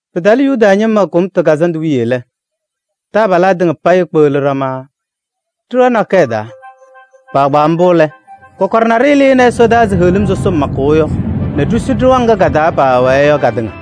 Pɩtalɩ Yuda ñɩma Kʋmtʋ Kazandʋ wiye lɛ, taabalaa tɩŋa payɩ kpeɣli ɖama ɖɩɣa nakɛyɛ taa. Kpaagbaa mbʋ lɛ, kɔkɔɖɛ naɖɩyɛ lɩnɩ ɛsɔdaa ɛzɩ heɣlim sɔsɔm makʋʋ yɔ nɛ ɖisu ɖɩɣa ŋga ka-taa paawɛɛ yɔ katɩŋa.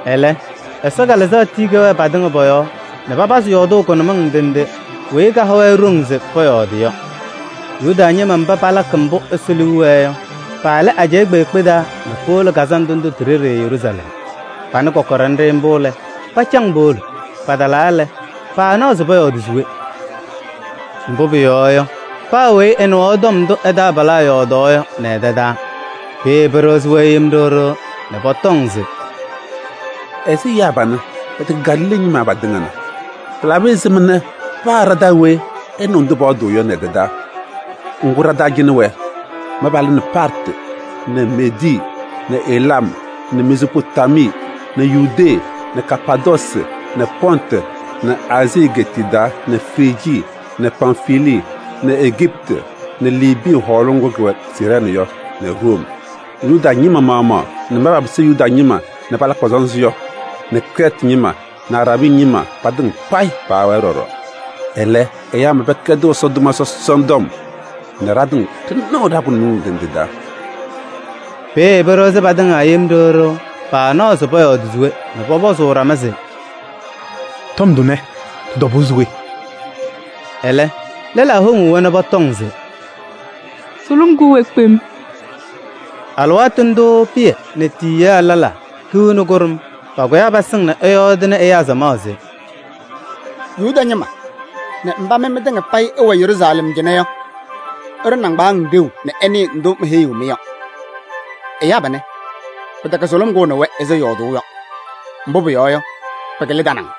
Ɛlɛ Ɛsɔ Kalɩzaɣ tii kɛwɛɛ patɩŋa pɔ-yɔɔ nɛ papazɩ yɔɔdʋʋ kʋnʋmɩŋ ndɩ ndɩ weyi kaha-wɛ ɖoŋ se pɔyɔɔdɩ yɔ. Yuda ñɩma mba palakɩ mbʋ Ɛsɔ liu wɛɛ yɔ, paalɩ ajɛɛ kpeekpe taa nɛ powolo kazandʋ ndʋ ti-ɖeɖe Yeruusalɛm. Panɩ kɔkɔɖɛ nɖɩ mbʋ lɛ, pacaŋ powolo. Patalaa lɛ, paanaɣ se pɔyɔɔdɩ se we, mbʋ pʋyɔɔ yɔ, paa weyi ɛnɩɣaɣ tɔm ndʋ taabalaa yɔɔdaɣ yɔ nɛ ɛ-tɛ taa. Peeye pɩɖɩɣzɩ-wɛ yem ɖɩɣ ɖɩɣ nɛ pɔtɔŋ se: “Ɛzɩ ɛyaa panɛ pɛtɛkɛ Galilee ñɩma patɩŋa na? Pɩlabɩ ɛzɩma nɛ paa ɖa-taa weyi ɛnɩɣ ndʋ pɔyɔɔdʋʋ yɔ nɛ ɛ-tɛ taa? Ŋgʋ, ɖa-taa cɩnɛ wɛ mba palɩnɩ Partɩ nɛ Meedii nɛ Elam nɛ Mezoopotamii nɛ Yudee nɛ Kapaadoosi nɛ Pɔntɩ nɛ Aazii egeetiye taa nɛ Frijii nɛ Pamfilii nɛ Ejiptɩ nɛ Liibii hɔɔlʋʋ ŋgʋ kʋwɛ Siirɛɛnɩ yɔ nɛ Room. Yuda ñɩma maɣmaɣ nɛ mba papɩsɩ Yuda ñɩma nɛ palakɩ pɔ-sɔnzɩ yɔ nɛ Krɛɛtɩ ñɩma nɛ Araabii ñɩma patɩŋa payɩ paawɛɛ ɖɔɖɔ. Ɛlɛ ɛyaa mba pɛkɛdɩɣ Ɛsɔ tʋma sɔsɔna tɔm nɛ ɖatɩŋa ɖɩnɩɣ ɖa-kʋnʋmɩŋ ndɩ ndɩ taa!” Peeye pɩɖɩɣzɩ patɩŋa yem ɖɩɣ ɖɩɣ, paanaɣ pɔyɔɔdɩ se we nɛ pɔpɔzʋʋ ɖama se: “Tɔm tʋnɛ, tɩ-tɔbʋʋ se we?” Ɛlɛ lɛlaa woŋuu-wɛ nɛ pɔtɔŋ se: “Sʋlʋm kʋʋ-wɛ kpem!” Alɩwaatʋ ndʋʋ Pɩyɛ nɛ tiyiyaa lɛlaa hiu nɛ kʋɖʋm pakʋyaa pasɩŋ nɛ ɛyɔɔdɩnɩ ɛyaa samaɣ se: “Yuda ñɩma nɛ mba mɩ mɩtɩŋa payɩ ɩwɛ Yeruusalɛm cɩnɛ yɔ! Ɩɖʋ nɩŋgbaaŋ ɖeu nɛ ɩnɩɩ tɔm ndʋ meheyiɣ-mɩ yɔ. Ɛyaa panɛ, pɩtɛkɛ sʋlʋm kʋʋnɩ-wɛ ɛzɩ ɩyɔɔdʋʋ yɔ, mbʋ pʋyɔɔ yɔ, pɩkɩlɩ tanaŋ.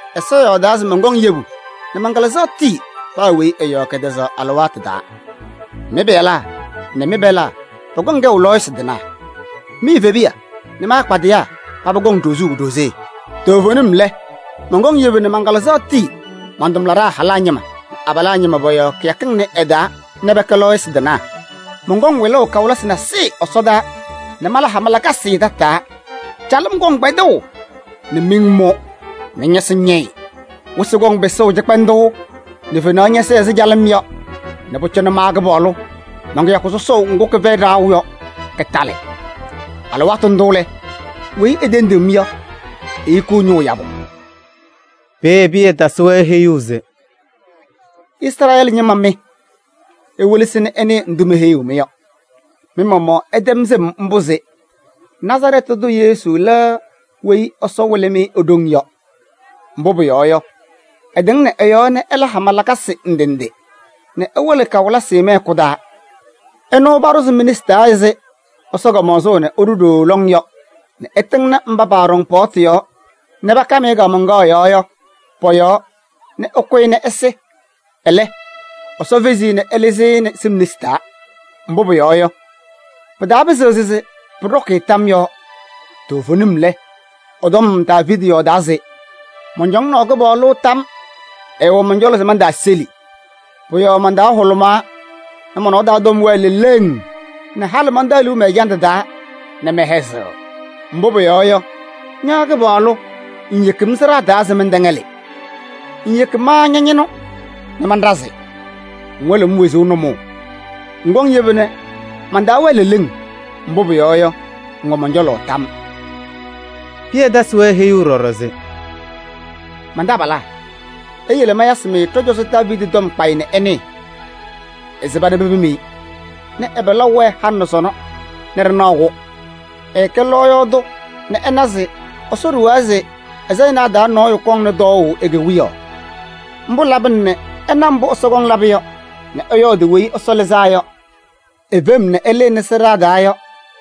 ‘Ɛsɔ yɔɔdaa se mɔnkɔŋ yebu nɛ man-Kalɩzaɣ tii paa weyi ɛ-yɔɔ kɛtɛzaɣ alɩwaatʋ taa. Mɩ-pɩyalaa nɛ mɩ-pɛlaa pɔkɔŋ kɛʋ lɔɔyɩsɩ tɩnaa. Mi-evebiya nɛ mɩ-akpadɩyaa, paba kɔŋ ɖozuu ɖozee. Toovenim lɛ, mɔnkɔŋ yebu nɛ man-Kalɩzaɣ tii man-tʋmlaɖaa halaa ñɩma nɛ abalaa ñɩma pɔ-yɔɔ kɩyakɩŋ ɩnʋ ɩ-taa nɛ pɛkɛ lɔɔyɩsɩ tɩnaa. Mɔnkɔŋ wɩlʋʋ kawɩlɩsɩ nasɩyɩ ɛsɔdaa nɛ mala hama lakasɩ tataa: calɩm kɔŋ kpɛdʋʋ nɛ miŋ mʋ nɛ ñɔsɩ ñɛyɩ. Wɩsɩ kɔŋ pɩsʋʋ cɩkpɛndʋʋ nɛ fenaɣ ñɛsɛɛ ɛzɩ calɩm yɔ nɛ pʋcɔ ma Kɩpaɣlʋ man-kɩyakʋ sɔsɔʋ ŋgʋ kɩfɛyɩ ɖaɣʋ yɔ, kɩtalɩ. Alɩwaatʋ ndʋ lɛ, weyi etendiɣ-m yɔ, ehikiɣ ñʋʋ yabʋ.’” Peeye Pɩyɛ tasɩ-wɛ heyuu se: “Izrɛɛlɩ ñɩma mɩ! Iwelesi nɛ ɩnɩɩ ndʋ meheyiɣ-mɩ yɔ: mɩ-maɣmaɣ ɩtɛm sɩm mbʋ se Nazarɛɛtɩ tʋ Yesu lɛ weyi Ɛsɔ wɩlɩ-mɩ e-ɖoŋ yɔ. Mbʋ pʋyɔɔ yɔ, ɛtɩŋnɩ ɛ-yɔɔ nɛ ɛla hama lakasɩ ndɩ ndɩ nɛ ɛwɩlɩ kawɩlɩsɩ mɩ-hɛkʋ taa. Ɛnʋ paɖʋzɩ mi-nesi taa ɛzɩ Ɛsɔ kamaɣzʋʋ nɛ ɛɖʋ ɖooo lɔŋ yɔ nɛ ɩtɩŋnɩ mba paaɖɔŋ paɣtʋ yɔɔ nɛ pakam-ɩ kaamaŋkaɣ yɔɔ yɔ pɔ-yɔɔ nɛ ɩkʋ-ɩ nɛ ɛsɩ. Ɛlɛ, Ɛsɔ fezi-i nɛ ɛlɩzɩ-ɩ nɛ sɩm nesi taa. Mbʋ pʋyɔɔ yɔ, pɩtaapɩzɩɣ se pʋɖɔkɩ-ɩ tam yɔɔ. Toovenim lɛ, ɛ-tɔm Daaviidi yɔɔdaa se: ‘Mɔncɔŋaɣnɩ Kɩpaɣlʋ tam. Ɛɛwɛ mɔn-cɔlɔ se mantaaseli. Pʋ-yɔɔ man-taa hʋlʋmaa nɛ mɔ-nɔɔ taa tɔm wɛɛ leleŋ nɛ halɩ mantaɣ liu mɛ-ɛjandʋ taa nɛ mɛhɛzɩɣ. Mbʋ pʋyɔɔ yɔ, ña Kɩpaɣlʋ ŋŋyeki-m sɩɖaa taa nɛ mɛntɛŋɛlɩ. Ŋŋyeki ma ña-ñɩnʋ nɛ manɖazɩ. Ŋwɩlɩ-m wezuu nʋmɔʋ, ŋkɔŋ yebu nɛ man-taa wɛɛ leleŋ. Mbʋ pʋyɔɔ yɔ, ŋwɛ mɔn-cɔlɔ tam.’” Pɩyɛ tasɩ-wɛ heyuu ɖɔɖɔ se: “Man-taabalaa! Iyele mayasɩ-mɩ ɖɔ-cɔzɔ Daaviidi tɔm kpayɩ nɛ ɩnɩɩ: ɛsɩba nɛ pepim-i nɛ ɛ-pɩlaʋ wɛɛ halɩ nɛ sɔnɔ nɛ ɖɩnaɣ-kʋ. Ɛɛkɛ lɔɔyaɣ tʋ nɛ ɛna se Ɛsɔ ɖuwaa se ɛ-sayɩnaa taa nɔɔyʋ kɔŋnɩ tɔɔʋ e-kewiyaɣ. Mbʋ labɩna nɛ ɛna mbʋ Ɛsɔ kɔŋ labʋ yɔ nɛ ɛyɔɔdɩ Weyi Ɛsɔ Lɩzaa Yɔ e-fem nɛ ɛlɩnɩ sɩɖaa taa yɔ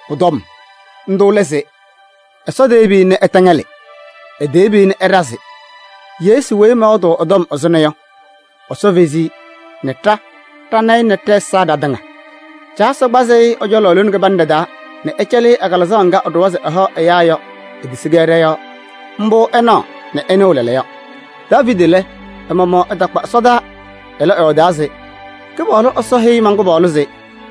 pʋ-tɔm. Ndʋ lɛ se: ‘Ɛsɔ teyebi-i nɛ ɛtɛŋɛlɩ. Eteyebi-i nɛ ɛɖazɩ.’ Yesu weyi mɔyɔɔdʋʋ ɛ-tɔm ɛzʋnɔ yɔ, Ɛsɔ fezi-i nɛ ɖa ɖana-ɩ nɛ ɖɛ-ɛza ɖatɩŋa. Caa Ɛsɔ kpazɩ-ɩ ɛ-cɔlɔ lone kɩbanɖɛ taa nɛ ɛcɛlɩ-ɩ ɛ-Kalɩzaɣ ŋga ɛɖʋwa se ɛhaɣ ɛyaa yɔ: etisi-kɛ ɖɔ-yɔɔ. Mbʋ ɩnaɣ nɛ ɩnɩɣ lɛɛlɛɛyɔ. Daaviidi lɛ, ɛ-maɣmaɣ ɛtakpa ɛsɔdaa. Ɛlɛ, ɛyɔɔdaa se: ‘Kɩpaɣlʋ Ɛsɔ heyi man-Kɩpaɣlʋ se: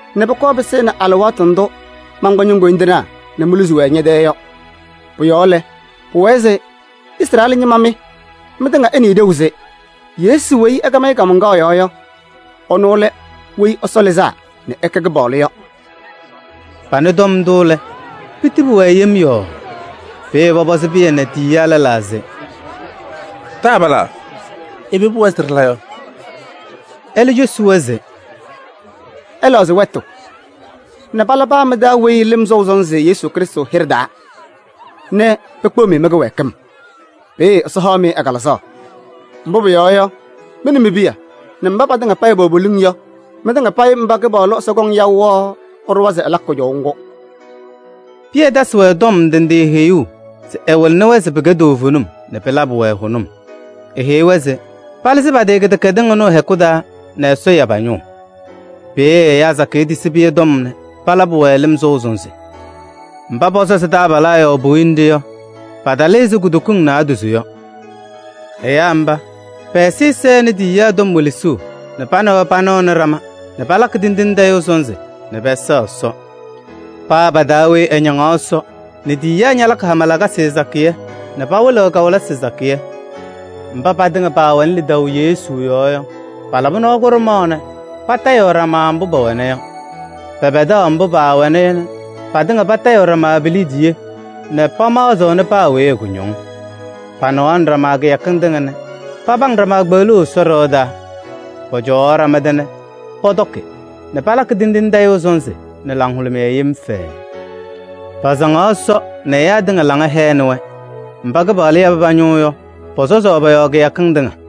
nɛ pʋkɔɔ pɩsɩnɩ alɩwaatʋ ndʋ mankpa ño-koyindinaa nɛ moluzi-wɛ ñɛ-tɛɛ yɔ.’ Pʋ-yɔɔ lɛ, pʋwɛɛ se Izrɛɛlɩ ñɩma mɩ mɩtɩŋa, ɩnɩɩ ɖeu se: Yesu weyi ɩkam-ɩ kaamaŋkaɣ yɔɔ yɔ, ɛnʋ lɛ Weyi Ɛsɔ Lɩzaa nɛ ɛkɛ Kɩpaɣlʋ yɔ!” Panɩ tɔm ndʋ lɛ, pitili-wɛ yem yɔɔɔ. Peeye pɔpɔzɩ Pɩyɛ nɛ tiyiyaa lɛlaa se: “Taabalaa! Ɛbɛ pʋwɛɛ se ɖɩla yɔ?” Ɛlɛ cosi-wɛ se: “Ɩlɛɣzɩ wɛtʋ nɛ pala paa mɩ-taa weyi lɩm sɔʋ sɔnzɩ Yesu Krɩstʋ hɩɖɛ taa nɛ pekpeɣ-mɩ mɩ-kɩwɛɛkɩm. Peeye Ɛsɔ haɣ-mɩ ɛ-Kalɩzaɣ. Mbʋ pʋyɔɔ yɔ, mɩ nɛ mi-piya nɛ mba patɩŋa pɛwɛ poliŋ yɔ: mɩtɩŋa payɩ mba Kɩpaɣlʋ Ɛsɔ kɔŋ yaʋ yɔ, ɛɖʋwa se ɛlakɩ kʋjɔʋ ŋgʋ.” Pɩyɛ tasɩ-wɛ tɔm ndɩ ndɩ heyuu se ɛwɩlɩnɩ-wɛ se pɩkɛ toovenim nɛ pɩlabɩ-wɛ hʋnʋm. Eheyi-wɛ se palɩzɩ pa-tɩ kɩdɛkɛdɩŋ ɩnʋ ɩ-hɛkʋ taa nɛ Ɛsɔ ya pa-ñʋʋ. Peeye ɛyaa sakɩyɛ tisi Pɩyɛ tɔm nɛ palabɩ-wɛ lɩm sɔʋ sɔnzɩ. Mba pɔsɔzɩ taabalaa yɔɔ puwiye nɖɩ yɔ, patalɩ ɛzɩ kutokiŋ naadozo yɔ. Ɛyaa mba, pɛ-ɛzɩyɛ sɛnɩ tiyiyaa tɔm welesuu nɛ pa nɛ wɛ panɩɣnɩ ɖama nɛ palakɩ tindine tayʋʋ sɔnzɩ nɛ pɛsɛɣ Ɛsɔ. Paa pa-taa weyi ɛñaŋaɣ Ɛsɔ nɛ tiyiyaa ñalakɩ hama lakasɩ sakɩyɛ nɛ pawɩlɩɣ kawɩlɩsɩ sakɩyɛ. Mba patɩŋa paawɛnɩ lidaʋ Yesu yɔɔ yɔ, paalabɩ nɔɔ kʋɖʋmaɣ nɛ patayɩɣ ɖama mbʋ mbʋ pɛwɛna yɔ. Pɛpɛdaɣ mbʋ paawɛna yɔ nɛ patɩŋa patayɩɣ ɖama pi-liidiye nɛ pamaɣzɩɣnɩ paa weyi ɛ-kʋñɔŋ. Panɩɣaɣnɩ ɖama kɩyakɩŋ tɩŋa nɛ papaŋ ɖama kpeɣluu Ɛsɔ ɖɩɣa taa. Pɔcɔwaɣ ɖama tɛ nɛ pɔtɔkɩ nɛ palakɩ tindine tayʋʋ sɔnzɩ nɛ laŋhʋlʋmɩyɛ yem fɛɛɛ. Pasaŋaɣ Ɛsɔ nɛ ɛyaa tɩŋa laŋa hɛɣnɩ-wɛ. Mba Kɩpaɣlʋ yabɩ pa-ñʋʋ yɔ, pɔsɔzaɣ pɔ-yɔɔ kɩyakɩŋ tɩŋa.